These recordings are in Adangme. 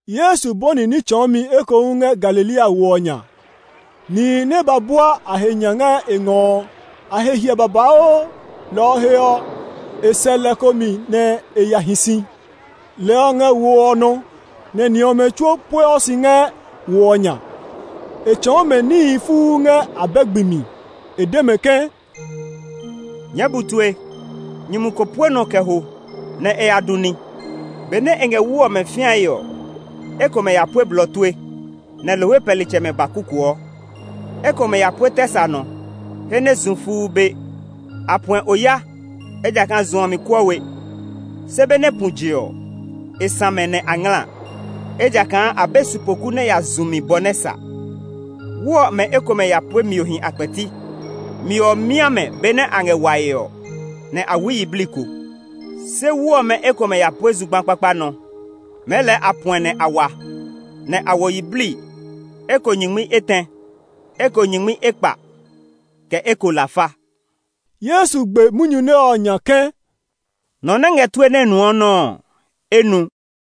Yesu bɔni ní tsɔɔmi ekohu ngɛ Galilea wo ɔ nya. Nihi nɛ ba bua a he nya ngɛ e ngɔ ɔ, a he hiɛ babauu, lɔ ɔ he ɔ, e sɛ lɛ ko mi nɛ e ya hi si. Lɛ ɔ ngɛ wo ɔ nɔ, nɛ ni ɔmɛ tsuo pueɔ si ngɛ wo ɔ nya. E tsɔɔ mɛ níhi fuu ngɛ abɛ gbi mi. E de mɛ ke, “Nyɛɛ bu tue! Nyumu ko pue nɔ kɛ ho nɛ e ya du ní. Benɛ e ngɛ wu ɔmɛ fĩae ɔ, ekomɛ ya pue blɔ tue, nɛ lohwe pɛlitsɛmɛ ba kukuɔ. Ekomɛ ya pue tɛ sa nɔ he nɛ zu fuu be. A puɛ oya, ejakaa zu ɔ mi kuɔ we. Se benɛ pu je ɔ, e sã mɛ nɛ a ngla, ejakaa a be sipoku nɛ ya zu mi bɔ nɛ sa. Wu ɔmɛ ekomɛ ya pue miohi a kpɛti. Mio ɔ mia mɛ benɛ a ngɛ wae ɔ, nɛ a wui yiblii ko. Se wu ɔmɛ ekomɛ ya pue zugba kpakpa nɔ. Mɛɛ lɛɛ a puɛ nɛ a wa, nɛ a wo yiblii, eko nyingmi etɛ, eko nyingmi ekpa, kɛ eko lafa.” Yesu gbe munyu nɛ ɔ nya ke, “Nɔ nɛ ngɛ tue nɛ nuɔ nɔ́ ɔ, e nu.”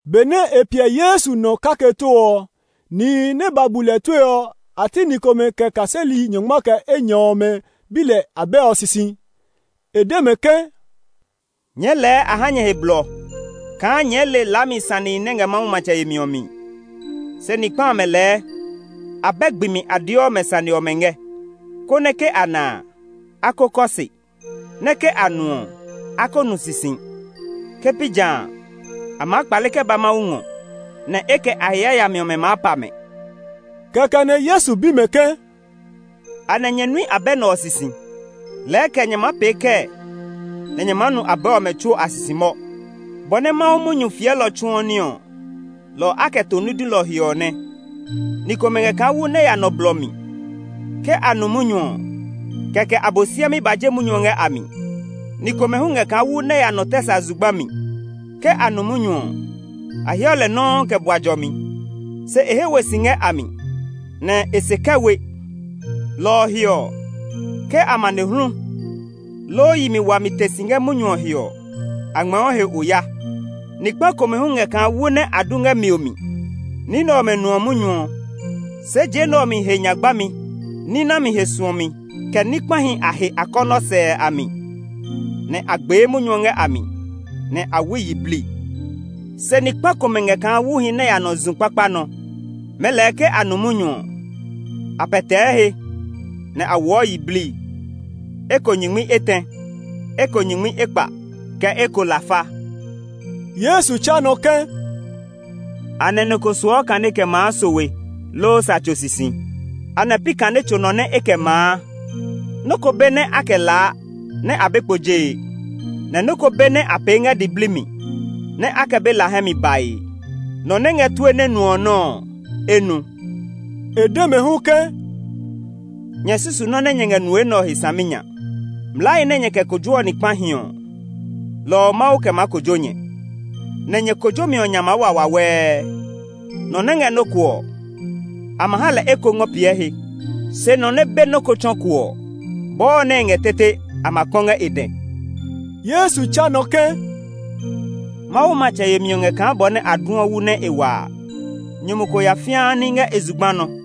Benɛ e piɛ Yesu nɔ kake too ɔ, nihi nɛ ba bu lɛ tue ɔ, a ti ni komɛ kɛ kaseli nyɔngma kɛ enyɔ ɔmɛ bi lɛ abɛ ɔ sisi. E de mɛ ke, “Nyɛɛ lɛɛ a ha nyɛ he blɔ kaa nyɛɛ le laami sanehi nɛ ngɛ Mawu matsɛ yemi ɔ mi; se ni kpa amɛ lɛɛ abɛ gbi mi a deɔ mɛ sane ɔmɛ ngɛ, konɛ ‘Ke a na a, a ko kɔ se, nɛ ke a nu ɔ, a ko nu sisi. Ke pi jã a, a maa kpale kɛ ba Mawu ngɔ, nɛ e kɛ a he yayami ɔmɛ maa pa mɛ.’” Kɛkɛ nɛ Yesu bi mɛ ke, “Anɛ nyɛ nui abɛ nɛ ɔ sisi? Lɛɛ kɛ nyɛ maa pee kɛɛ nɛ nyɛ maa nu abɛ ɔmɛ tsuo a sisi mɔ? Bɔ nɛ Mawu munyu fiɛlɔ tsuɔ ní ɔ, lɔ ɔ a kɛ to ní dulɔ he ɔ nɛ. Ni komɛ ngɛ kaa wu nɛ ya nɔ blɔ mi. Ke a nu munyu ɔ, kɛkɛ Abosiami ba je munyu ɔ ngɛ a mi. Ni komɛ hu ngɛ kaa wu nɛ ya nɔ tɛ sa zugba mi. Ke a nu munyu ɔ, a heɔ lɛ nɔuu kɛ bua jɔmi. Se e he we si ngɛ a mi; nɛ e se kɛ we. Lɔ ɔ he ɔ, ke amanehlu, loo yi mi wami te si ngɛ munyu ɔ he ɔ, a ngmɛɛɔ he oya. Ni kpa komɛ hu ngɛ kaa wu nɛ a du ngɛ mio mi. Ni nɛ ɔmɛ nuɔ munyu ɔ, se je nɛ ɔ mi he nya gbami, ní nami he suɔmi, kɛ ní kpahi a he akɔnɔ sɛɛ a mi, nɛ a gbee munyu ɔ ngɛ a mi, nɛ a wui yiblii. Se ni kpa komɛ ngɛ kaa wuhi nɛ ya nɔ zu kpakpa nɔ. Mɛɛ lɛɛ ke a nu munyu ɔ, a pɛtɛɛ he, nɛ a woɔ yiblii, eko nyingmi etɛ, eko nyingmi ekpa, kɛ eko lafa.” Yesu tsa nɔ ke, “Anɛ nɔ ko suɔ kane kɛ maa sowe, loo sa tso sisi? Anɛ pi kane tso nɔ nɛ e kɛ maa? Nɔ́ ko be nɛ a kɛ laa nɛ a be kpo jee, nɛ nɔ́ ko be nɛ a pee ngɛ diblii mi nɛ a kɛ be la hɛ mi bae. Nɔ nɛ ngɛ tue nɛ nuɔ nɔ́ ɔ, e nu.” E de mɛ hu ke, “Nyɛ susu nɔ́ nɛ nyɛ ngɛ nue nɛ ɔ he saminya! Mlaahi nɛ nyɛ kɛ kojoɔ ni kpahi ɔ, lɔ ɔ Mawu kɛ maa kojo nyɛ; nɛ nyɛ kojomi ɔ nya maa wa wawɛɛ. Nɔ nɛ ngɛ nɔ́ ko ɔ, a ma ha lɛ eko ngɔ piɛ he; se nɔ nɛ be nɔ́ ko tsɔ ko ɔ, bɔɔ nɛ e ngɛ ɔ tete a ma kpɔ ngɛ e dɛ.” Yesu tsa nɔ ke, “Mawu matsɛ yemi ɔ ngɛ kaa bɔ nɛ a duɔ wu nɛ e waa. Nyumu ko ya fĩaa ní ngɛ e zugba nɔ.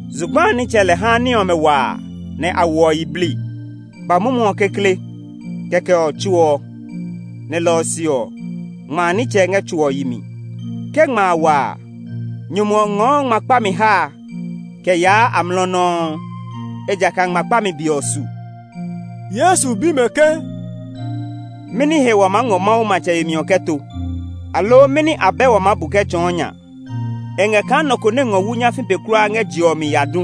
Zugba a nitsɛ lɛ haa ní ɔmɛ waa nɛ a woɔ yiblii, ba mumu ɔ kekle, kɛkɛ ɔ tso ɔ, nɛ lɔ ɔ se ɔ, ngma a nitsɛ ngɛ tso ɔ yi mi. Ke ngma a wa a, nyumu ɔ ngɔɔ ngma kpami ha a kɛ yaa amlɔ nɔuu, ejakaa ngma kpami be ɔ su.” Yesu bi mɛ ke, “Mɛni he wa maa ngɔ Mawu matsɛ yemi ɔ kɛ to? Aloo mɛni abɛ wa maa bu kɛ tsɔɔ nya? E ngɛ kaa nɔ ko nɛ ngɔ wu nyafii pe kulaa ngɛ je ɔ mi ya du.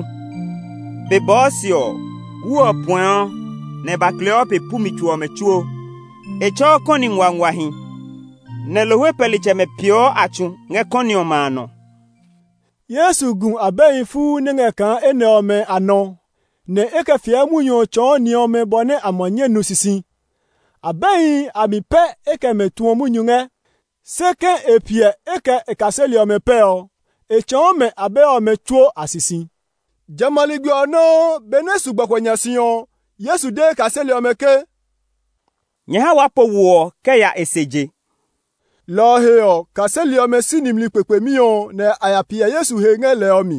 Be bɔɔ se ɔ, wu ɔ puɛɔ nɛ e ba kleɔ pe pu mi tso ɔmɛ tsuo. E tsɛ̃ɔ kɔni nguanguahi, nɛ lohwe pɛlitsɛmɛ peeɔ a tsu ngɛ kɔni ɔmɛ a nɔ.” Yesu gu abɛhi fuu nɛ ngɛ kaa enɛ ɔmɛ a nɔ nɛ e kɛ fiɛ munyu ɔ tsɔɔ ni ɔmɛ bɔ nɛ a ma nyɛ nu sisi. Abɛhi a mi pɛ e kɛ mɛ tuɔ munyu ngɛ, se ke e piɛ e kɛ e kaseli ɔmɛ pɛ ɔ, e tsɔɔ mɛ abɛ ɔmɛ tsuo a sisi. Jamɛ a ligbi ɔ nɔuu, benɛ e su gbɔkuɛ nya si ɔ, Yesu de e kaseli ɔmɛ ke, “Nyɛ ha waa po wo ɔ kɛ ya e se je.” Lɔ ɔ he ɔ, kaseli ɔmɛ si nimli kpekpemi ɔ, nɛ a ya piɛ Yesu he ngɛ lɛ ɔ mi,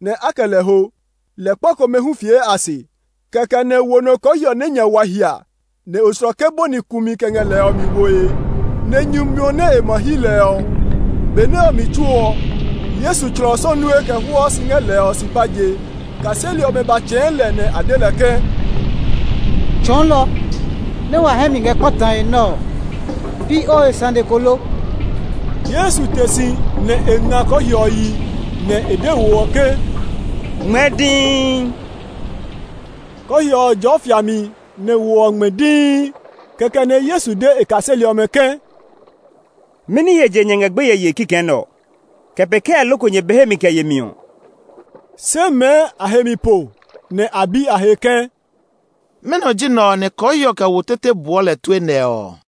nɛ a kɛ lɛ ho. Lɛ kpa komɛ hu fie a se. Kɛkɛ nɛ wo nɔ kɔɔhiɔ nɛ nya wa hia, nɛ oslɔke bɔni kumi kɛ ngɛ lɛ ɔ mi woe, nɛ nyu miɔ nɛ e ma hyi lɛ ɔ. Be nɛ ɔ mi tsuo ɔ, Yesu tslɔ sɔnue kɛ hwɔɔ si ngɛ lɛ ɔ supa je. Kaseli ɔmɛ ba tsɛ̃ɛ̃ lɛ nɛ a de lɛ ke, “Tsɔɔlɔ, nɛ wa hɛ mi ngɛ kpatae nɛ ɔ, pi o he sane ko lo?” Yesu te si, nɛ e nga kɔɔhiɔ ɔ yi, nɛ e de wo ɔ ke, “Ngmɛɛ dii!” Kɔɔhiɔ ɔ jɔɔ fiami, nɛ wo ɔ ngmɛ dii. Kɛkɛ nɛ Yesu de e kaseli ɔmɛ ke, “Mɛni he je nyɛ ngɛ gbeye yee kikɛ nɛ ɔ? Kɛ pee kɛɛ loko nyɛ be hemi kɛ yemi ɔ?” Se mɛɛ a he mi po, nɛ a bi a he ke, “Mɛnɔ ji nɛ ɔ nɛ kɔɔhiɔ kɛ wo tete buɔ lɛ tue nɛ ɔ!”